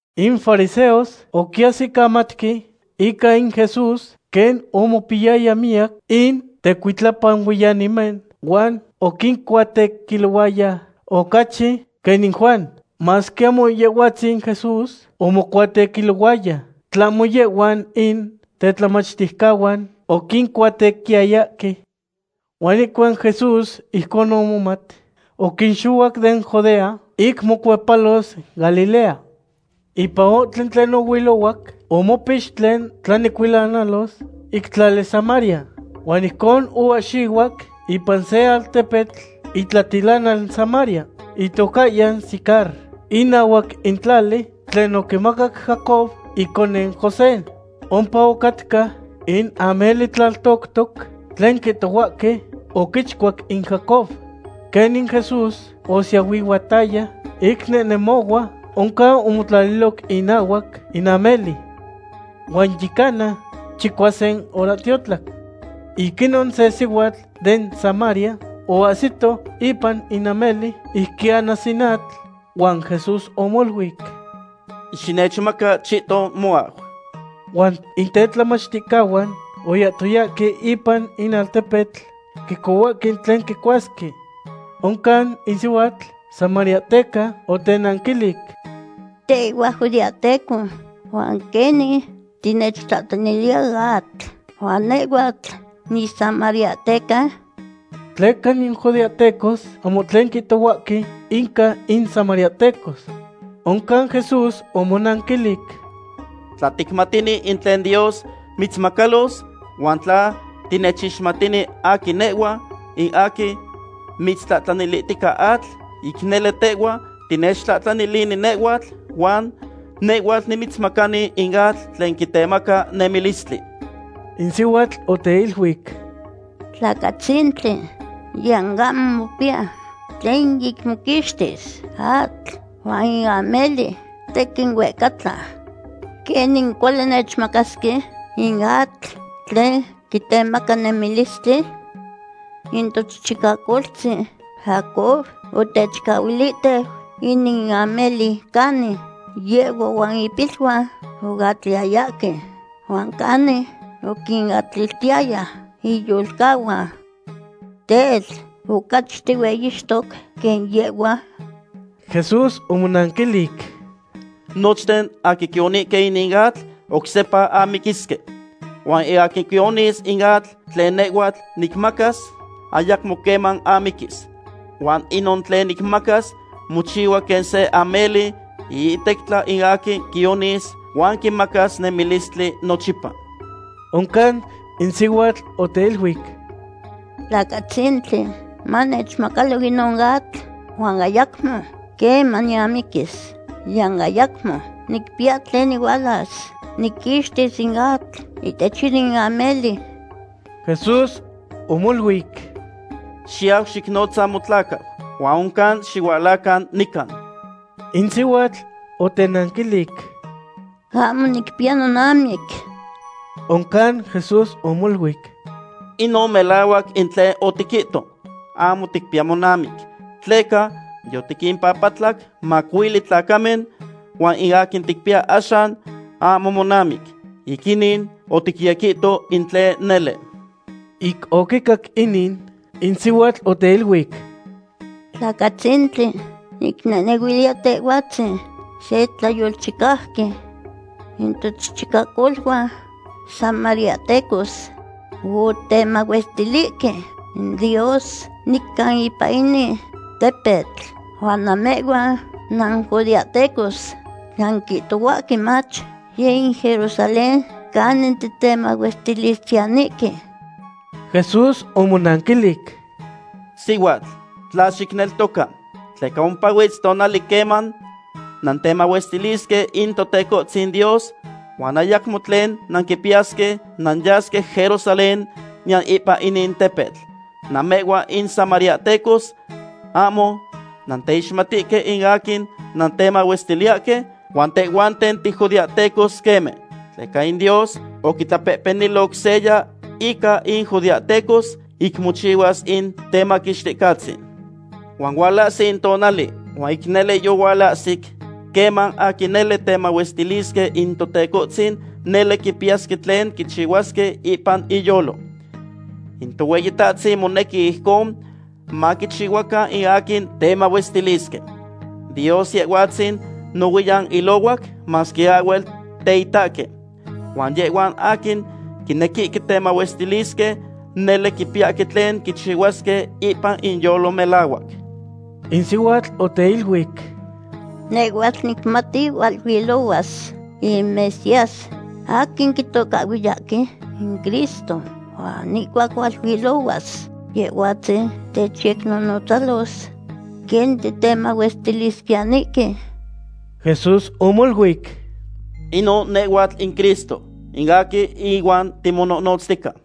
In fariseos oquiahsicamatque ica in Jesús quen omopiyaya miyac in tecuitlapanuiyanimen huan oquincuatequilohuaya ocachi quen in Juan. Masque ahmo Yehhuatzin Jesús omocuatequilohuaya, tlahmo yehhuan in tetlamachticahuan oquincuatequiyayahque. Huan ihcuac Jesús ijcon omomat, oquixohuac den Judea ic mocuepalos Galilea. Ipan ohtli tlen ohuilohuac, omopix tlen tlanecuilanalos ic tlali Samaria. Huan ijcon oahxihuac ipan se altepetl itlatilanal Samaria, itocahyan Sicar, inahuac in tlali tlen oquimacac Jacob in iconeu José. Ompa ocatca in ameli tlaltoctoc tlen quihtohuahque oquichcuac in Jacob. Quenin Jesús osiahuihuataya ic nehnemohua, oncan omotlaliloc inahuac in ameli. Huan yi cana chicuasin horahtiotlac. Ic inon se sihuatl den Samaria oahsito ipan in ameli ic quianas in atl, huan Jesús omoluic: ―Xinechmaca chihton moau. Huan in teltamachticahuan oyahtoyahque ipan in altepetl quicohuahque tlen quicuasque. Oncan in sihuatl samariahteca otenanquilic: ―Tehhua tijudeahteco, ¿huan quenin tinechtlahtlaniliya atl, huan nehhuatl nisamariahteca? Tleca in judeahtecos ahmo tlen quihtohuahque inca in samariahtecos. Oncan Jesús omonanquilic: ―Tla ticmatini in tlen Dios mitzmacalos, huan tla tinechixmatini aquin nehhua, in aquin mitztlahtlanilihtica atl, ic nele tehhua tinechtlahtlanilini nehhuatl, huan nehhuatl nimitzmacani in atl tlen quitemaca nemilistli. In sihuatl oteiluic: ―Tlacatzintli, niyan ahmo mopiya tlen ic moquixtis atl, huan in ameli tequin huehcatla. ¿Quenin cuali nechmacasque in atl tlen quitemaca nemilistli? In tochichicacoltzin Jacob otechcahuilihteu inin ameli canin yehhua huan ipiluan oatliyayahque, huan canin oquinatliltiyaya iyolcahuan. Tel, ¿ocachi tihueyixtoc quen yehhua? Jesús omonanquilic: ―Nochten aquin quionihque inin atl, oc sepa amiquisque. Huan in aquin quionis in atl tlen nehhua nicmacas, ayacmo queman amiquis. Huan inon tlen nicmacas mochihua quen se ameli iihtectla in aquin quionis huan quimacas nemilistli nochipa. Oncan in sihuatl oteiluic: ―Tlacatzintli, manechmacalo inon atl, huan ayacmo queman niamiquis, niyan ayacmo nicpiya tlen nihualas niquixtis in atl ihtech inin ameli. Jesús omoluic: ―Xiyau xicnotza motlacau, huan oncan xihualacan nican. In sihuatl otenanquilic: ―Ahmo nicpiya nonamic. Oncan Jesús omoluic: ―Inon melahuac in tlen otiquihto, ahmo ticpiya monamic, tleca yotiquimpapatlac macuili tlacamen, huan in aquin ticpiya axan ahmo monamic. Ic inin oticyequihto in tlen nele. Ic oquicac inin, in sihuatl oteiluic: ―Tlacatzintli, nicnehnehuiliya tehhuatzin se tlayolchicauqui. In tochichicacoluan samariahtecos otemahuestilihque in Dios nican ipan inin tepetl, huan namehhuan nanjudeahtecos nanquihtohuahque mach yeh in Jerusalén canin titemahuestilisquiyanihque. Jesús omonanquilic: ―Sihuatl, tla xinechneltoca, tleca ompahuitz tonali queman nantemahuestilisque in Totecohtzin Dios huan ayacmo tlen nanquipiyasque nanyasque Jerusalén niyan ipan inin tepetl. Namehhuan in samariahtecos ahmo nanteixmatihque in aquin nantemahuestiliyahque, huan tehhuanten tijudeahtecos queme. Tleca in Dios oquitlapehpeniloc seya inca in judeahtecos ic mochihuas in Temaquixticahtzin. Huan hualahsi in tonali huan nele yohualahsic, queman aquin nele temahuestilisque in Tohueyitahtzin nele quipiyasque tlen quichihuasque ipan inyolo. In Tohueyitahtzin monequi ijcon maquichihuacan in aquin temahuestilisque. Dios Yehhuatzin nohuiyan ilohuac masque ahhuel teitahque, huan yehhuan aquin quinequihque temahuestilisque nele quipiyahque tlen quichihuasque ipan inyolo melahuac. In sihuatl oteiluic: ―Nehhuatl nicmati hualuilohuas in Mesías, aquin quitocahhuiyahque in Cristo, huan ihcuac hualuilohuas Yehhuatzin, techyecnonotzalos quen titemahuestilisquiyanihque. Jesús omoluic: ―Inon nehhuatl in Cristo, in aquin ihuan timonohnotztica.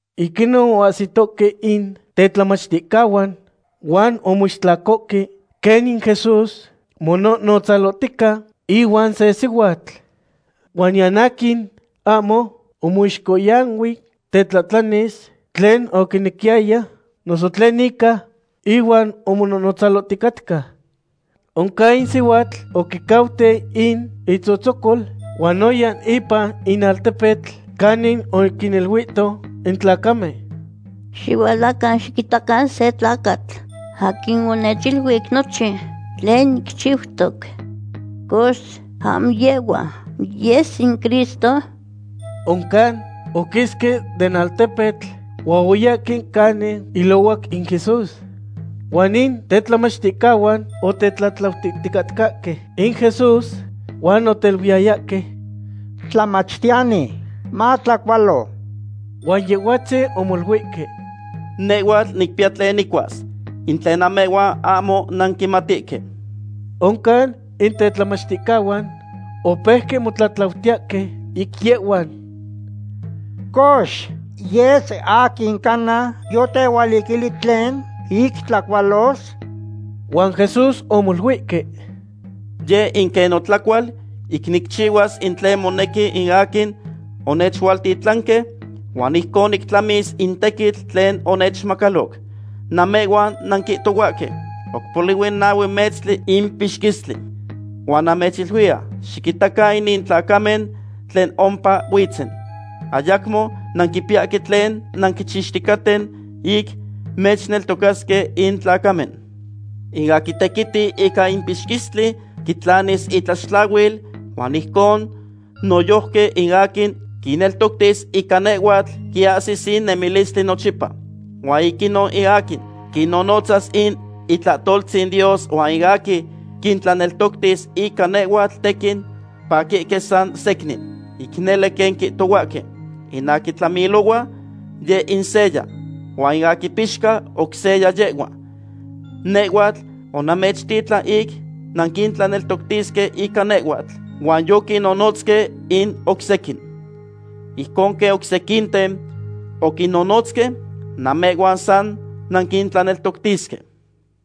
Ic inon oahsitohque in tetlamachticahuan huan omoistlacohque quen in Jesús monohnotzalotica ihuan se sihuatl. Huan niyan aquin ahmo omoixcohyanui tetlahtlanis tlen oquinequiyaya, noso tlen ica ihuan omonohnotzaloticatca. Oncan in sihuatl oquicauteu in itzotzocol huan oya ipan in altepetl, canin oquiniluito in tlacamen: ―Xihualacan xiquitacan se tlacatl aquin onechiluic nochin tlen nicchiutoc. Cox, ¿ahmo yehhua yes in Cristo? Oncan oquisque den altepetl huan oyahque canin ilohuac in Jesús. Huan in tetlamachticahuan otetlatlautiticatcahque in Jesús, huan oteiluiyayahque: ―Tlamachtiyani, matlacualo. Huan Yehhuatzin omoluihque: ―Nehhuatl nicpiya tlen nicuas, in tlen namehhuan ahmo nanquimatihque. Oncan in tetlamachticahuan opeuque motlahtlaniyahque ic yehhuan: ―Cox, ¿yes aquin cana yotehualiquili tlen ic tlacualos? Huan Jesús omoluihque: ―Yeh in quen notlacual ic nicchihuas in tlen monequi in aquin onechualtitlanque, huan ijcon nictlamis in tequitl tlen onechmacaloc. Namehhuan nanquihtohuahque: “Oc polihui nahue metztli in pixquistli.” Huan namechiluiya: Xiquitacan inin tlacamen tlen ompa huitzen. Ayacmo nanquipiyahque tlen nanquichixticaten ic nechneltocasque in tlacamen. In aquin tequiti ica in pixquistli quitlanis itlaxtlahuil, huan ijcon noyojqui in aquin quinneltoctis ica nehhuatl quiahsis in nemilistli nochipa. Huan ic inon in aquin quinnotzas in itlahtoltzin Dios huan in aquin quintlaneltoctis ica nehhuatl tequin paquihque san secnin. Ic nele quen quihtohuahque: “In aquin tlamilohua, yeh in seya, huan in aquin pixca, oc seya yehhua.” Nehhuatl onamechtitlan ic nanquintlaneltoctisque ica nehhuatl, huan yoquinnonotzque in oc sequin. Ijcon quen oc sequinten oquinnonotzque, namehhuan san nanquintlaneltoctisque.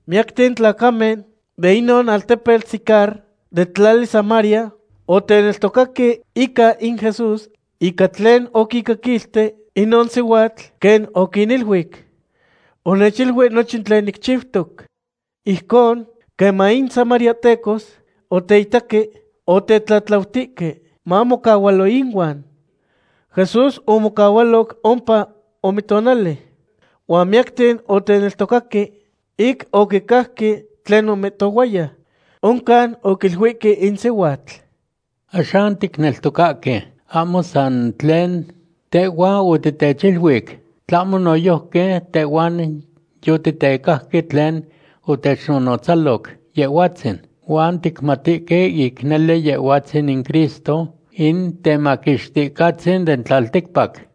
Miyacten tlacamen de inon altepetl Sicar, den tlali Samaria, oteneltocaque ica in Jesús ica tlen oquincaquilti inon sihuatl, quen oquiniluic: “Onechiluic nochin tlen nicchiutoc.” Ijcon, queman in samariahtecos oteitaque, otetlatlautihque mamocahualo inuan. Jesús omocahualoc ompa ome tonali. Huan miyacten oteneltocaque ic oquicajque tlen omihtohuaya. Oncan oquiluihque in sihuatl: ―Axan ticneltocahque ahmo san tlen tehhua otitechiluic, tlahmo noyojqui tehhuan yotitecajque tlen otechnonotzaloc Yehhuatzin, huan ticmatihque ic nele Yehhuatzin in Cristo, in Temaquixticahtzin den tlalticpac.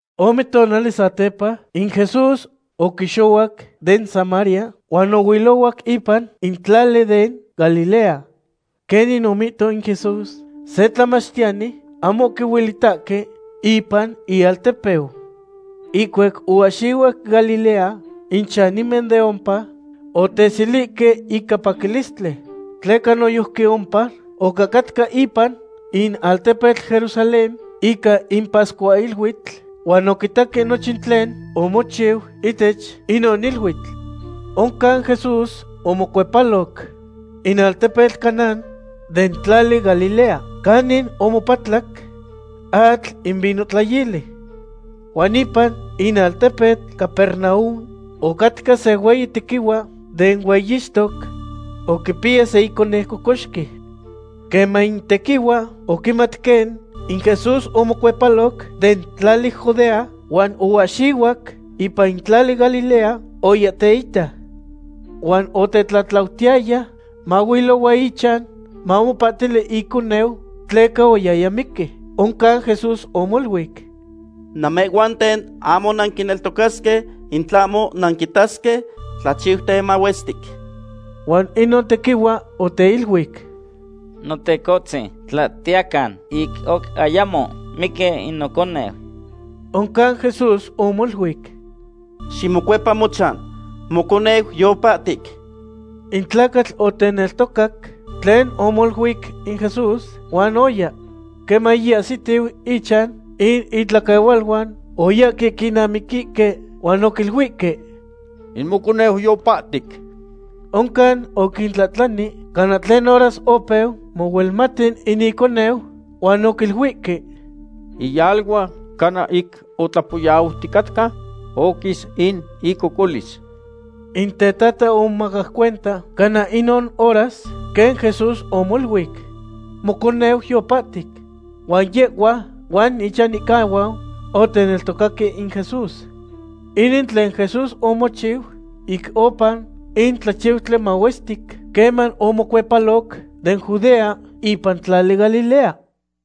Ome tonali satepa, in Jesús oquixohuac den Samaria huan ohuilohuac ipan in tlali den Galilea. Quenin omihto in Jesús, se tlamachtiyani ahmo quihuelitahque ipan ialtepeu. Ihcuac oahxihuac Galilea, in chanimen den ompa oteselihque ica paquilistli, tleca noyojqui ompa ocahcatca ipan in altepetl Jerusalén ica in pascuahiluitl, huan oquitaque nochin tlen omochiu ihtech inon iluitl. Oncan Jesús omocuepaloc in altepetl Caná den tlali Galilea, canin omopatlac atl in vinohtlayili. Huan ipan in altepetl Capernaum ocatca se hueyi tequihua den hueyixtoc oquipiya se iconeu cocoxqui. Queman in tequihua oquimat quen in Jesús omocuepaloc den tlali Judea huan oahxihuac ipan in tlali Galilea, oya teita. Huan otetlatlautihtaya mahuilohua ichan mamopahtili iconeu, tleca oyaya miqui. Oncan Jesús omoluic: ―Namehhuanten ahmo nanquineltocasque in tlahmo nanquitasque tlachiuten mahuestic. Huan inon tequihua oteiluic: ―Notecohtzin, tla tiyacan, ic oc ayamo miqui in noconeu. Oncan Jesús omoluic: ―Ximocuepa mochan; moconeu yopahtic. In tlacatl oteneltocac tlen omoluic in Jesús, huan oya. Queman yiahsitiu ichan, in itlaquehualuan oyahque quinamiquihque huan oquiluihque: ―In moconeu yopahtic. Oncan oquintlahtlani cana tlen horas opeu mohuelmati in iconeu, huan oquiluihque: ―Yiyalua cana ic otlapoyauticatca, oquis in icocolis. In tetata omomacac cuenta cana inon horas quen Jesús omoluic: “Moconeu yopahtic”; huan yehhua huan ichanihcahuan oteneltocaque in Jesús. Inin tlen Jesús omochiu ic oupa in tlachiutli mahuestic queman omocuepaloc den Judea ipan tlali Galilea.